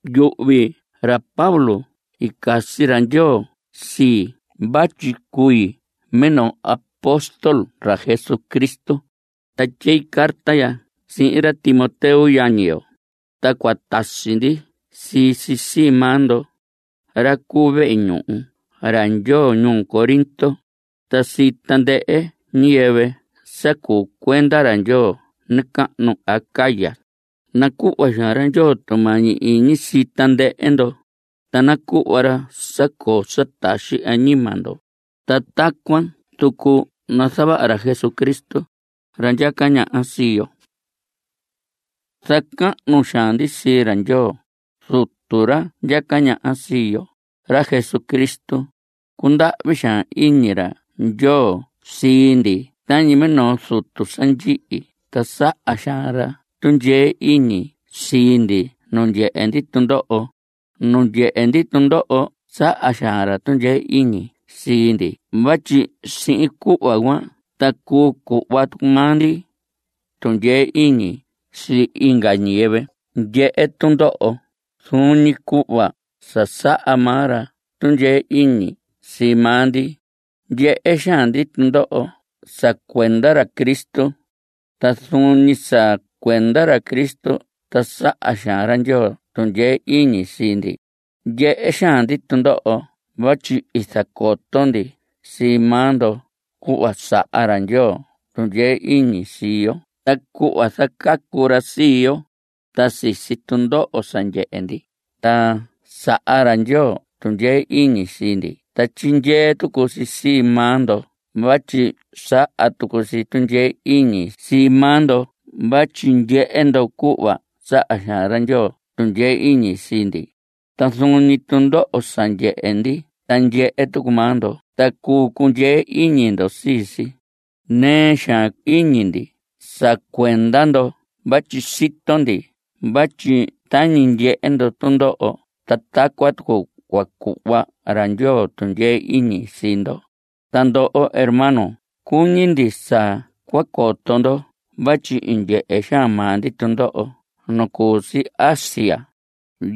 Yuhvi ra Pablo i casi ra Ndyoo sii vatyi cui minoo apóstol ra Jesucristo. Ta tyei carta ya sihin ra Timoteo yañi yo, ta cua tasi ndi sii si sii maa ndo, ra cu vehe ñuhu ra Ndyoo ñuu Corinto, ta sii tandɨhɨ ñiyɨvɨ sa cuu cuenda ra Ndyoo nacahnu Acaya. Nacuhva xaan ra Ndyoo tumañi iñi sii tandɨhɨ ndo, ta nacuhva ra sa coo sa taxi añima ndo, ta tacuan tucu nazavaha ra Jesucristo, ra ndyaca ñaha sii yo. Zacahnu xaan ndi sii ra Ndyoo, Zutu ra ndyaca ñaha sii yo, ra Jesucristo. Cundahvi xaan iñi ra Ndyoo sii ndi tañi minoo zutu sa ndyihi, ta saha xaan ra tundyee iñi sii ndi nu ndyehe ndi tundoho. Nu ndyehe ndi tundoho saha xaan ra tundyee iñi sii ndi vatyi sihin cuhva cuan ta cuu cuhva maa ndi tundyee iñi sii inga ñiyɨvɨ ndyehe tundoho zuun ñi cuhva sa saha maa ra tundyee iñi sii maa ndi. Ndyehe xaan ndi tundoho sa cuenda ra Cristo. Ta zuun ñi sa cuenda ra Cristo ta saha xaan ra Ndyoo tundyee iñi sii ndi. Ndyehe xaan ndi tundoho vatyi i zacoto ndi sii maa ndo cuhva saha ra Ndyoo tundyee iñi sii yo ta cuhva zacacu ra sii yo. Ta sisi tundoho sa ndyehe ndi, ta saha ra Ndyoo tundyee iñi sii ndi, ta tyindyee tucu si sii maa ndo vatyi saha tucu si tundyee iñi sii maa ndo vatyi ndyehe ndo cuhva saha xaan ra Ndyoo tundyee iñi sii ndi. Ta zuun ñi tundoho sa ndyehe ndi ta ndyehe tucu maa ndo, ta cuu cundyee iñi ndo sii si. Nɨɨ xaan iñi ndi sa cuenda ndo vatyi sito ndi vatyi tañi ndyehe ndo tundoho ta tacuan tucu cua cuhva ra Ndyoo tundyee iñi sii ndo. Ta ndoho hermanos, cuñi ndi sa cua coto ndo vatyi i ndyehe xaan maa ndi tundoho nu cu si Asia.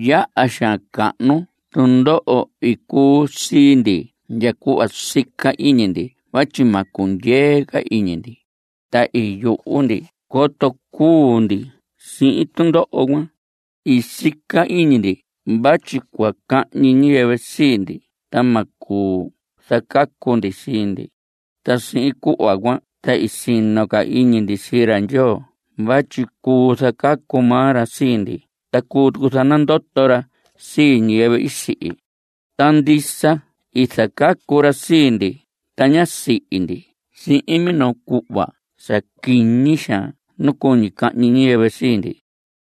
Yaha xaan cahnu tundoho i cuu sii ndi ndya cuhva i sica iñi ndi vatyi ma cundyee ca iñi ndi. Ta i yuhu ndi coto cuu ndi sihin tundoho cuan. I sica iñi ndi vatyi cua cahñi ñiyɨvɨ sii ndi ta ma cuu zacacu ndi sii ndi. Ta sihin cuhva cuan ta i sino ca iñi ndi sii ra Ndyoo vatyi cuu zacacu maa ra sii ndi ta cuu tucu zanandoto ra sii ñiyɨvɨ i sihi. Ta ndisa i zacacu ra sii ndi, ta ñá sihi ndi sihin minoo cuhva sa quiñi xaan nu cuñi cahñi ñiyɨvɨ sii ndi.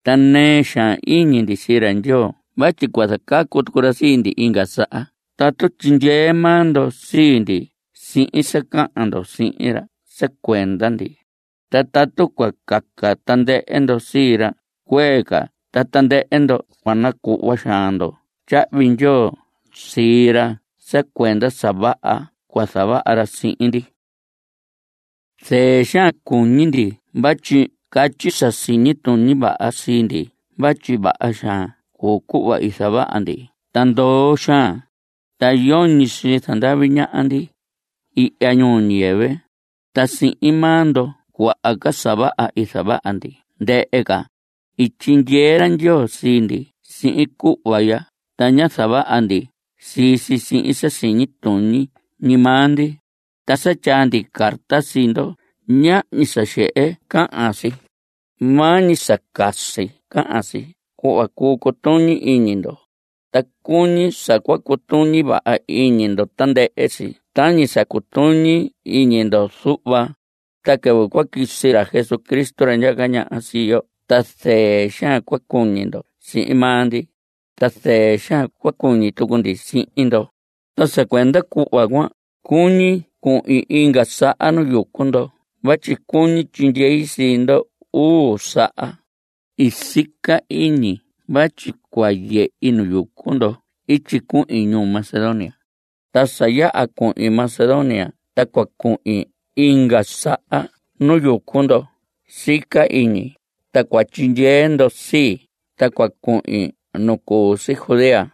Ta nɨɨ xaan iñi ndi sii ra Ndyoo vatyi cua zacacu tucu ra sii ndi inga saha tatu tyindyee maa ndo sii ndi sihin sa cahan ndo sihin ra sa cuenda ndi. Ta tatu cua caca tandɨhɨ ndo sii ra, cuee ca ta tandɨhɨ ndo cua nacuhva xaan ndo tyahvi ndyoo sii ra sa cuenda sa vaha cua zavaha ra sihin ndi. Zɨɨ xaan cuñi ndi vatyi catyi sa siñi tuñi vaha sii ndi vatyi vaha xaan cuu cuhva i zavaha ndi ta ndoo xaan, ta yoñi sii zandavi ñaha ndi ihya ñuu ñiyɨvɨ. Ta sihin maa ndo cuaha ca sa vaha i zavaha ndi ndɨhɨ ca. I tyindyee ra Ndyoo sii ndi sihin cuhva ya, ta ñá zavaha ndi sii si sihin sa siñi tuñi ñi maa ndi. Ta sa tyaa ndi carta sii ndo, ñahñi sa xehe cahan si. Maa ñi sa casi cahan si, cuhva cuu cutuñi iñi ndo. Ta cuñi sa cua cutuñi vaha iñi ndo tandɨhɨ si tañi sa cutuñi iñi ndo zuhva. Ta quɨvɨ cua quisi ra Jesús ra ndyaca ñaha sii yo ta zɨɨ xaan cua cuñi ndo sihin maa ndi, ta zɨɨ xaan cua cuñi tucu ndi sihin ndo. Ta sa cuenda cuhva cuan, cuñi cuhin inga saha nu yucu ndo vatyi cuñi tyindyei sii ndo uu saha. I sica iñi vatyi cua yehi nu yucu ndo ityi cuhin ñuu Macedonia. Ta sa yaha cuhin Macedonia ta cua cuhin inga saha nu yucu ndo sica iñi, ta cua tyindyee ndo sii, ta cua cuhin nu cu si Judea.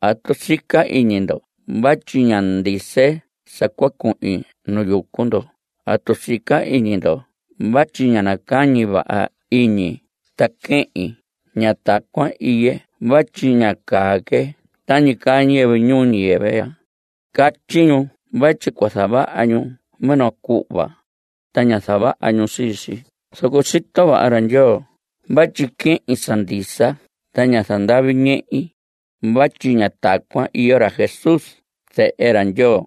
¿Atu sica iñi ndo vatyi ñá ndise sa cua cuhin nu yucu ndo? ¿Atu sica iñi ndo vatyi ñá nacañi vaha iñi ta quehin? Ña tacuan iye vatyi ña caa que tañi caa ñiyɨvɨ ñuu ñiyɨvɨ ya. Catyi ñu vatyi cua zavaha ñu minoo cuhva, ta ña zavaha ñu sii si. Zoco sito vaha ra Ndyoo vatyi quehin sa ndisa, ta ña zandavi ñehi. Vatyi ña tacuan iyo ra Jesús Zehe ra Ndyoo.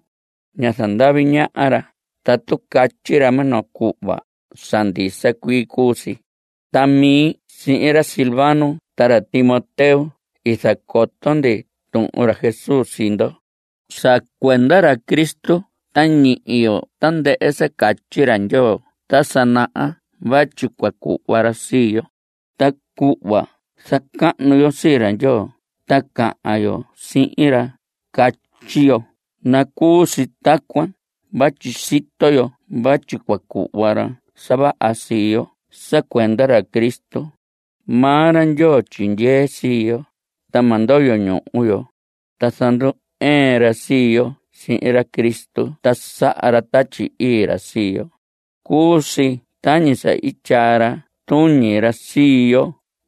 Ña zandavi ñaha ra. Tatu catyi ra minoo cuhva, sa ndisa cuii cuu si. Ta mi sihin ra Silvano ta ra Timoteo i zacoto ndi tuhun ra Jesús sii ndo. Sa cuenda ra Cristo ta ñihi yo tandɨhɨ sa catyi ra Ndyoo ta sa naha vatyi cua cuhva ra sii yo. Ta cuhva zacahnu yo sii ra Ndyoo ta cahan yo sihin ra, catyi yo: “Nacuu si tacuan” vatyi sito yo vatyi cua cuhva ra sa vaha sii yo sa cuenda ra Cristo. Maa ra Ndyoo tyindyee sii yo, ta ma ndoyo ñuhu yo. Ta zandu‑ɨɨn ra sii yo sihin ra Cristo. Ta saha ra Tatyi Ii ra sii yo. Cuu si tañi i tyaa ra tuñi ra sii yo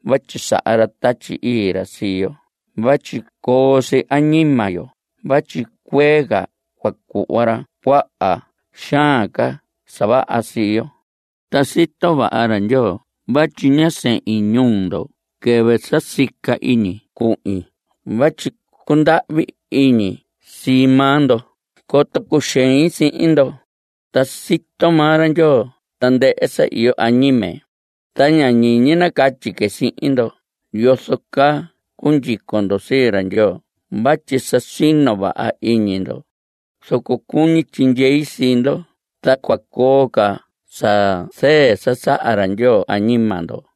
vatyi saha ra Tatyi Ii ra sii yo vatyi coo si añima yo vatyi cuee ca cua cuhva ra cuaha xaan ca sa vaha sii yo. Ta sito vaha ra Ndyoo vatyi ñá sehin ñuu ndo quɨvɨ sa i sica iñi cuhin vatyi cundahvi iñi sii maa ndo coto cuxein sihin ndo. Ta sito maa ra Ndyoo tandɨhɨ sa iyo añime. Ta ña ñiñi nacatyi que sihin ndo yozo caa cundyico ndo sii ra Ndyoo vatyi sa sino vaha iñi ndo. Zoco cuñi tyindyei sii ndo ta cua coo ca sa zɨɨ sa saha ra Ndyoo añima ndo.